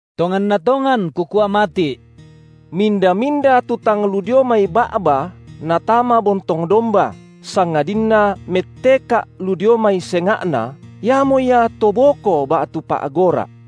Tonganna tongan Kukua mati’: minda-minda tu tang lu dio mai ba’ba natama bontong domba, sangadinna metteka’ lu dio mai senga’na, iamo ia to boko ba’tu pa’gora’.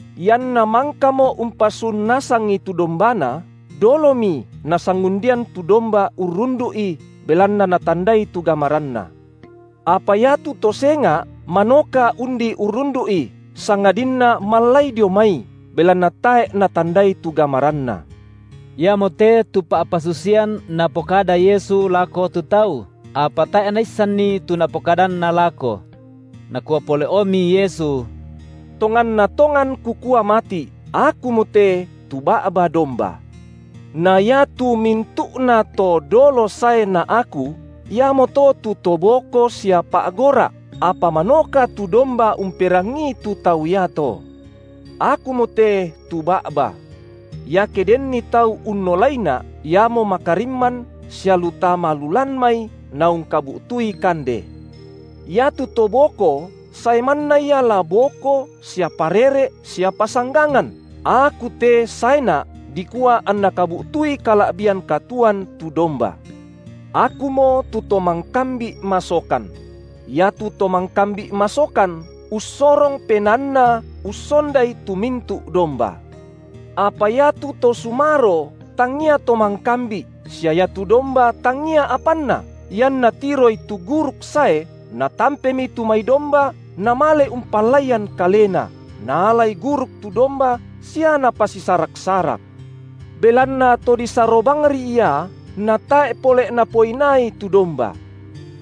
Ianna mangkamo umpasun nasangi tu dombana, dolomi nasangundian tu domba urrundu’i, belanna natandai tu gamaranna. Apa iatu to senga’ manoka undi urrundu’i, sangadinna mallai dio mai, belanna tae’ natandai tu gamaranna. Iamote tu pa’pasusian Napokada Yesu lako tu tau; apa tae’ naissanni tu Napokadanna lako. Nakua pole’omi Yesu: Tonganna tongan Kukua mati’, Akumote tu ba’ba domba. Na ia tu mintu’nato dolo sae na Aku, iamoto tu to boko sia pa’gora’, apa manoka tu domba umperangii tu tau iato. Akumote tu ba’ba. Iake denni tau unnolaiNa’, iamo makarimman sia lu tama lu lan mai naungkabu’tui kande. Iatu to boko sae manna ia la boko sia parere’ sia pasanggangan, Aku te saeNa’, dikua anna kabu’tui kala’bian katuoan tu domba. Akumo tu to mangkambi’ masokan; iatu to mangkambi’ masokan ussorong penaanna ussondai tu mintu’ domba. Apa iatu to sumaro tangia to mangkambi’, sia iatu domba tangia apanna, ianna tiroi tu guruk sae, natampemi tu mai domba namale umpallaian kalena, naalai guruk tu domba sia napasisarak-sarak. Belanna to disaro bangri ia, natae’ pole’napoinaai tu domba.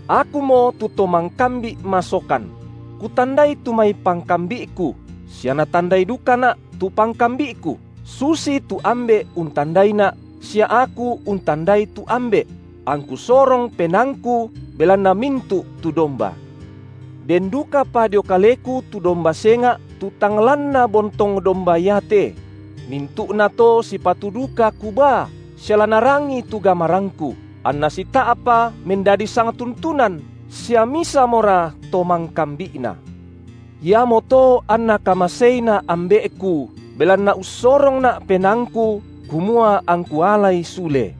Akumo tu to mangkambi’ masokan; Kutandai tu mai pangkambi’Ku, sia natandai dukaNa’ tu pangkambi’Ku, susitu Ambe’ untandaiNa’, sia Aku untandai tu Ambe’; angku sorong penaangKu belanna mintu’ tu domba. Den dukapa dio KaleKu tu domba senga’ tu tang lanna bontong domba iate; mintu’nato sipatu duka Kubaa, sia la narangi tu gamarangKu, anna sita’pa mendadi sangtuntunan, sia misamora to mangkambi’na. Iamoto anNa kamaseiNa’ Ambe’Ku, belanna ussorongNa’ penaangKu, kumua angKu alai sule.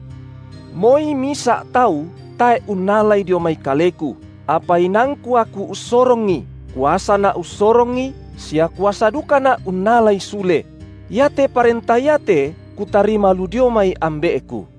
Moi misa’ tau tae’ unnalai dio mai Kaleku, apa inaangku Aku ussorongi. KuasaNa’ ussorongi sia kuasa dukaNa’ unnalai sule; iate parenta iate Kutarima lu dio mai Ambe’Ku.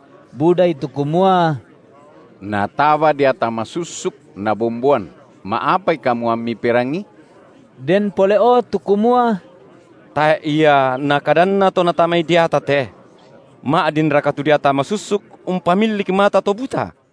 Budai tu kumua: Nataba deata masussuk nabomboan, ma’apai kamu ammi perangii? Den pole’o tu kumua: Tae’ ia nakadanna to natamai deata te. Ma’dinraka tu deata masussuk umpamillik mata to buta?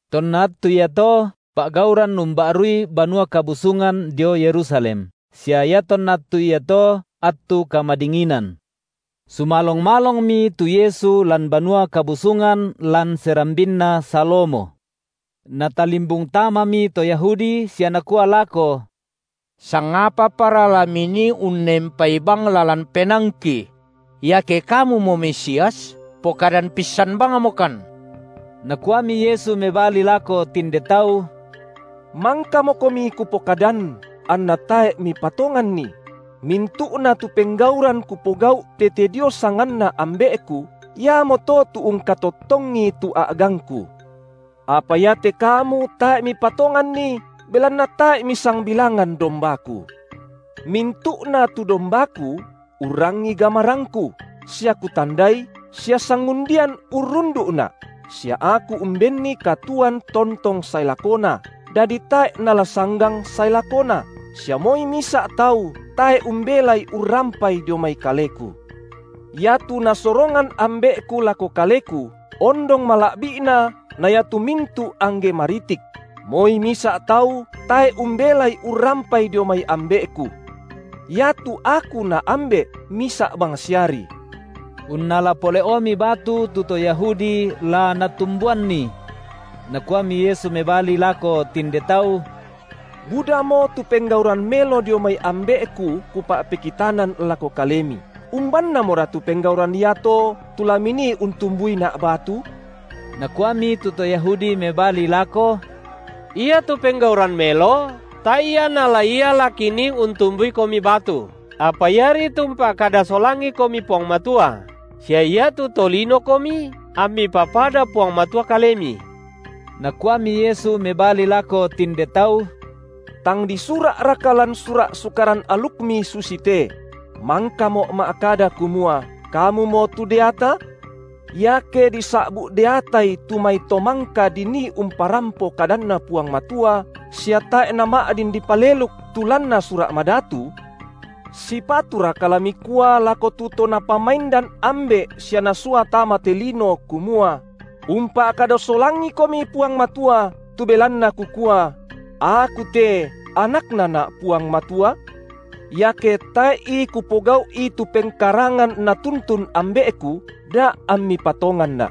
Tonna attu iato, pa’gauran umba’rui Banua Kabusungan dio Yerusalem, sia iatonna attu iato attu kamadinginan. Sumalong-malongmi tu Yesu lan Banua Kabusungan lan serambinna Salomo. Natalimbung tamami to Yahudi sia nakua lako: Sangapapara la Minii unnempai bang lalan penaangki? Iake Kamumo Mesias, pokadan pissan bangmokan. Nakuami Yesu mebali lako tinde tau: Mangkamokomi Kupokadan, anna tae’ mipatonganni; mintu’na tu penggauran Kupogau’ tete dio sanganNa Ambe’Ku, iamoto tu ungkatottongi tu a’gangKu. Apa iate kamu tae’ mipatonganni, belanna tae’ misangbilangan dombaKu. Mintu’na tu dombaKu urrangi gamarangKu, sia Kutandai, sia sangundian urrundu’Na’, sia Aku umbenni katuoan tontong sae lakona, dadi tae’ nala sanggang sae lakona, sia moi misa’ tau tae’ umbelai urrampai dio mai Kaleku. Iatu Nasorongan Ambe’Ku lako Kaleku, ondong mala’bi’na na iatu mintu’ angge maritik; moi misa’ tau tae’ umbelai urrampai dio mai Ambe’Ku. Iatu Aku na Ambe’ misa’ bangsiari. Unnala pole’omi batu tu to Yahudi la natumbuanNi. Nakuami Yesu mebali lako tinde tau: Budamo tu penggauran melo dio mai Ambe’Ku Kupa’pekitanan lako kalemi, umbannamora tu penggauran iato tu la minii untumbuiNa’ batu? Nakuami tu to Yahudi mebali lako: Iatu penggauran melo tae’ ia na ia la kinii untumbuiKomi batu, apa iari tu umpa’kada solangiKomi Puang Matua, sia iatu to linoKomi amMi papada Puang Matua KaleMi. Nakuami Yesu mebali lako tinde tau: Tang disura’raka lan Sura’ Sukaran alukmi susite: Mangkamo’ ma’kada kumua: kamumo tu deata? Iake disa’bu’ deatai tu mai to mangka dinii umparampo kadanNa Puang Matua sia tae’ nama’din dipaleluk tu lanna Sura’ Madatu, sipaturaka la mikua lako tu To Napamaindan Ambe’ sia Nasua tama te lino, kumua: Umpa’kada solangiKomi Puang Matua, tu belanna Kukua: Aku te, AnaknaNa’ Puang Matua? Iake tae’i Kupogau’i tu pengkarangan Natuntun Ambe’Ku, da’ ammi patonganNa’.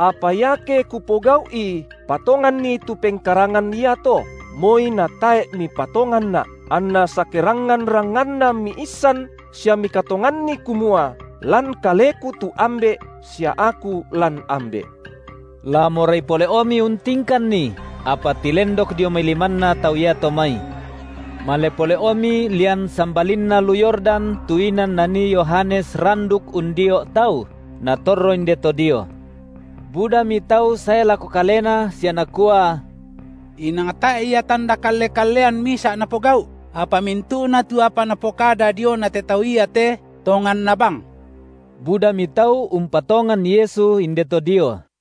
Apa iake kupogau’i, patonganni tu pengkarangan iato, moi natae’ mipatonganNa’, anna sakerangngan-rangnganna miissan sia mikatonganni kumua lan KaleKu tu Ambe’ sia Aku lan Ambe’. La morai pole’omi untingkanNi, apa tilendok dio mai limanna tau iato mai. Male pole’omi lian sambalinna lu Yordan tu inan nanii Yohanes randuk undio’ tau, Natorro inde to dio. Budami tau sae lako Kalena sia nakua: Inang tae’ ia tanda kalle-kallean misa’ Napogau’, apa mintu’na tu apa napokada diona te Tau iate, tonganna bang. Budami tau umpatongan Yesu inde to dio.